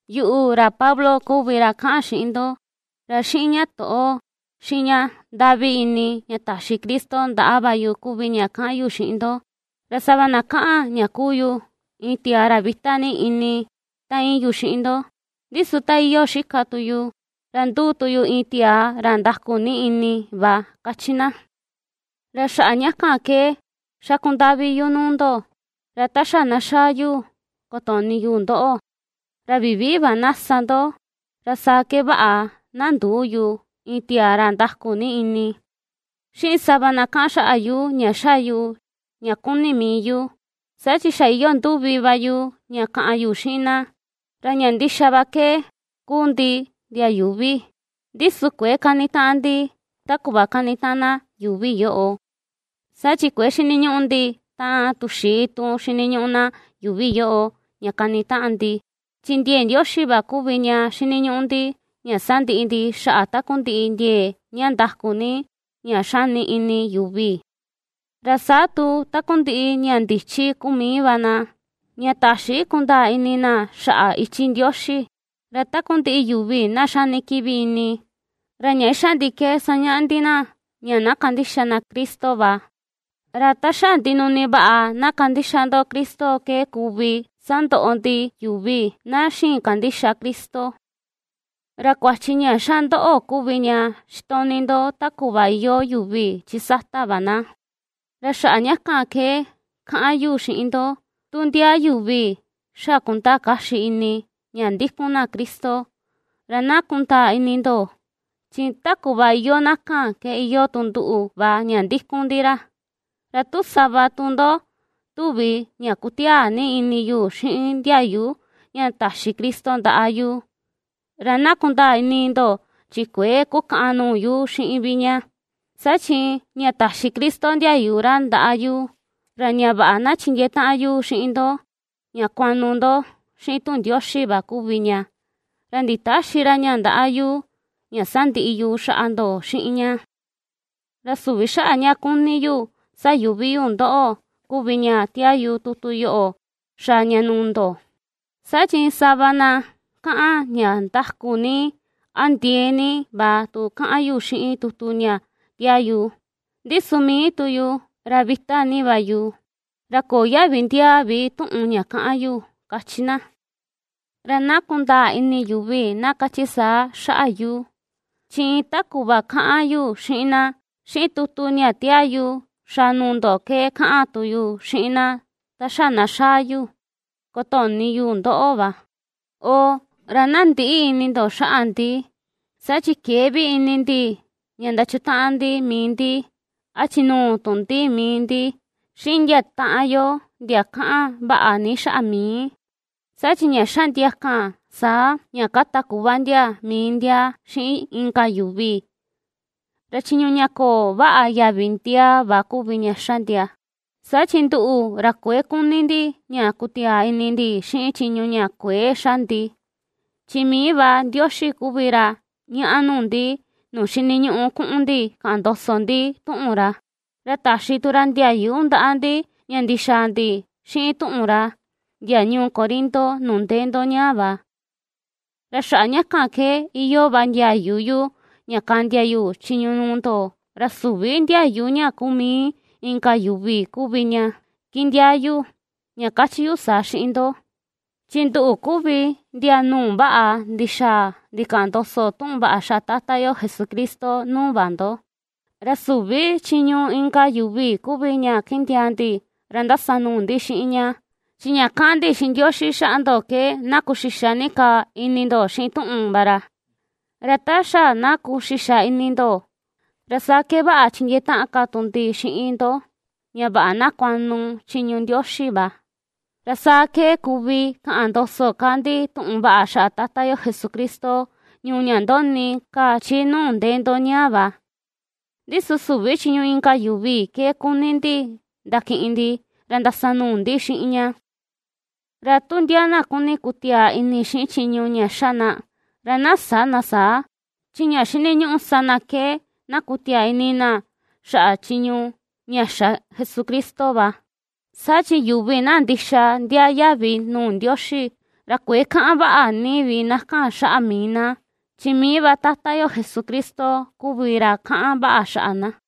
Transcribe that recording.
Yuꞌu, ra Pablo kuvi ra kaꞌan xiꞌin ndo, ra xiꞌin ña toꞌo, xiꞌin ña ndaꞌvi ini ña taxi Cristo ndaꞌa va yu kuvi ña kaꞌan yu xiꞌin ndo. Ra sava na kaꞌan ña kuu yu, iin tiaa ra vita ni ini ta iin yu xiꞌin ndo, ndi su ta iyoo xika tu yu, ra nduu tu yu iin tiaa ra ndaku ni ini va, ^kachi na. Ra xaꞌa ña kan ke xaku ndaꞌvi yu nuu ndo, ra ta xa na xaa yu kotoꞌni yu ndoꞌo, ra vivii va na sa ndo, ra saa ke vaꞌa na ndüu yu, iin tiaa ra ndaku ni ini, xiꞌin sava na kaꞌan xaꞌa yu ña ^xa yu ña kuni mii yu; saa chi xa iyoo nduvi va yu ña kaꞌan yu xiꞌin na. Ra ña ndixa va ke, kuu ndi ndia yuuvi, ndi su kuëe kanitaꞌan ndi ta kuꞌva kanitaꞌan na yuuvi yoꞌo. Saa chi kuëe xiniñuꞌu ndi taꞌan tuxii tun xiniñuꞌu na yuuvi yoꞌo ña kanitaꞌan ndi, chi ndiee Ndioxi va kuvi ña xiniñuꞌu ndi, ña sandiꞌi ndi xaꞌa takundiꞌi ndiee ña ndaku ni ña xani ini yuvi, ra saa tu takundiꞌi ña ndichi kuu mii va na, ña täxi kundaa ini na xaꞌa ichi Ndioxi. Ra takundiꞌi yuvi na xani kiꞌvi ini, ra ña xa ndi ke sañaꞌa ndi na ña na kandixa na Cristo va. Ra ta xa ndinuni vaꞌa na kandixa ndo Cristo ke kuvi sandoꞌo ndi yuvi na xïin kandixa Cristo. Ra kuachi ña ^xa ndoꞌo kuvi ña xitoꞌni ndo ta kuꞌva iyoo yuvi chi sata va na. Ra xaꞌa ña kan ke kaꞌan yu xiꞌin ndo, tu ndia yuvi xa kundaa kaxi ini ña ndikun na Cristo, ra na kundaa ini ndo, chi ta kuꞌva iyoo na kan ke iyoo tu nduꞌu va ña ndikun ndi ra. Ra tu sava tu ndo tuvi ña kutiaa ni ini yu xiꞌin ndiayu ña taxi Cristo ndaꞌa yu, ra na kundaa ini ndo, chi kuëe kukaꞌan nuu yu xiꞌin vi ña, saa chi ña taxi Cristo ndiayu ra ndaꞌa yu, ra ña vaꞌa na chindiee taꞌan yu xiꞌin ndo ña kuaꞌnu ndo xiꞌin tuꞌun Ndioxi va kuvi ña, ra nditäxi ra ña ndaꞌa yu ña sandiꞌi yu xaꞌa ndo xiꞌin ña. Ra süvi xaꞌa ña kuni yu sayuꞌvi yu ndoꞌo kuvi ña tiaa yu tutu yoꞌo xaa ña nuu ndo. Saa chi sava na kaꞌan ña ndaku ni a ndiee ni va tu kaꞌan yu xiꞌin tutu ña tiaa yu, ndi su mii tu yu, ra vita ni va yu, ra köo yaꞌvi ndiaa vi tuꞌun ña kaꞌan yu, ^kachi na. Ra na kundaa ini yuvi na kachi saa xaꞌa yu, chi iin ta kuꞌva ^kaꞌan yu xiꞌin na, xiꞌin tutu ña ^tiaa yu xaa nuu ndo ke kaꞌan tu yu xiꞌin na ta xa na xaa yu, kotoꞌni yu ndoꞌo va. ¡Oo, ra na ndïꞌi ini ndo xaꞌa ndi! Saa chi këe vi ini ndi ña ndachutaꞌan ndi mii ndi a chinuu tu ndi mii ndi xiꞌin ndia taꞌan yo ndia kaꞌan vaꞌa ni xaꞌa mii. Saa chi ña ^xa ndia kan saa, ña kata kuꞌva ndia mii ndia xiꞌin inka yuvi, ra chiñu ña köo vaꞌa yaꞌvi ndiaa va kuvi ña ^xa ndia. Saa chi nduꞌu, ra kuëe kuni ndi ña kutiaa ini ndi xiꞌin chiñu ña kuëe xa ndi. Chi mii va Ndioxi kuvi ra ^ñaꞌa nuu ndi, nuu xiniñuꞌu kuꞌun ndi kaꞌan ndoso ndi tuꞌun ra, ra taxi tu ra ndiayu ndaꞌa ndi ña ndixaa ndi xiꞌin tuꞌun ra, ndia ñuu Corinto nuu ndee ndo ñaa va. Ra xaꞌa ña kan ke iyoo va ndiayu yu ña kaꞌndia yu chiñu nuu ndo, ra süvi ndiayu ña kuu mii inka yuvi kuvi ña kindiaa yu ña kachi yu saa xiꞌin ndo, chi nduꞌu kuvi ndia nuu vaꞌa ndixaa ndikaꞌan ndoso tuꞌun vaꞌa xaꞌa Tata yo Jesucristo nuu va ndo. Ra süvi chiñu inka yuvi kuvi ña kindiaa ndi, ra ndasanuu ndi xiꞌin ña. Chi ña ^kaꞌan ndi xiꞌin Ndioxi xaꞌa ndo ke na kuxixa ni ka ini ndo xiꞌin tuꞌun va ra, ra ta xa na kuxixa ini ndo, ra saa ke vaꞌa chindiee taꞌan ka tu ndi xiꞌin ndo, ña vaꞌa na kuaꞌnu chiñu Ndioxi va. Ra saa ke kuvi kaꞌan ndoso ka ndi tuꞌun vaꞌa xaꞌa Tata yo Jesucristo ñuu ña ndoꞌni ka chi nuu ndee ndo ñaa va, ndi su süvi chiñu inka yuvi ke kuni ndi ndakiꞌin ndi, ra ndasanuu ndi xiꞌin ña. Ra tu ndia na kuni kutiaa ini xiꞌin chiñu ña xa na, ra na sä na saa, chi ña xiniñuꞌu sa na ke na kutiaa ini na xaꞌa chiñu ña xa Jesucristo va. Saa chi yuvi na ndixa ndiaa yaꞌvi nuu Ndioxi, ra kuëe kaꞌan vaꞌa ni vi na kan xaꞌa mii na, chi mii va Tata yo Jesucristo kuvi ra kaꞌan vaꞌa xaꞌa na.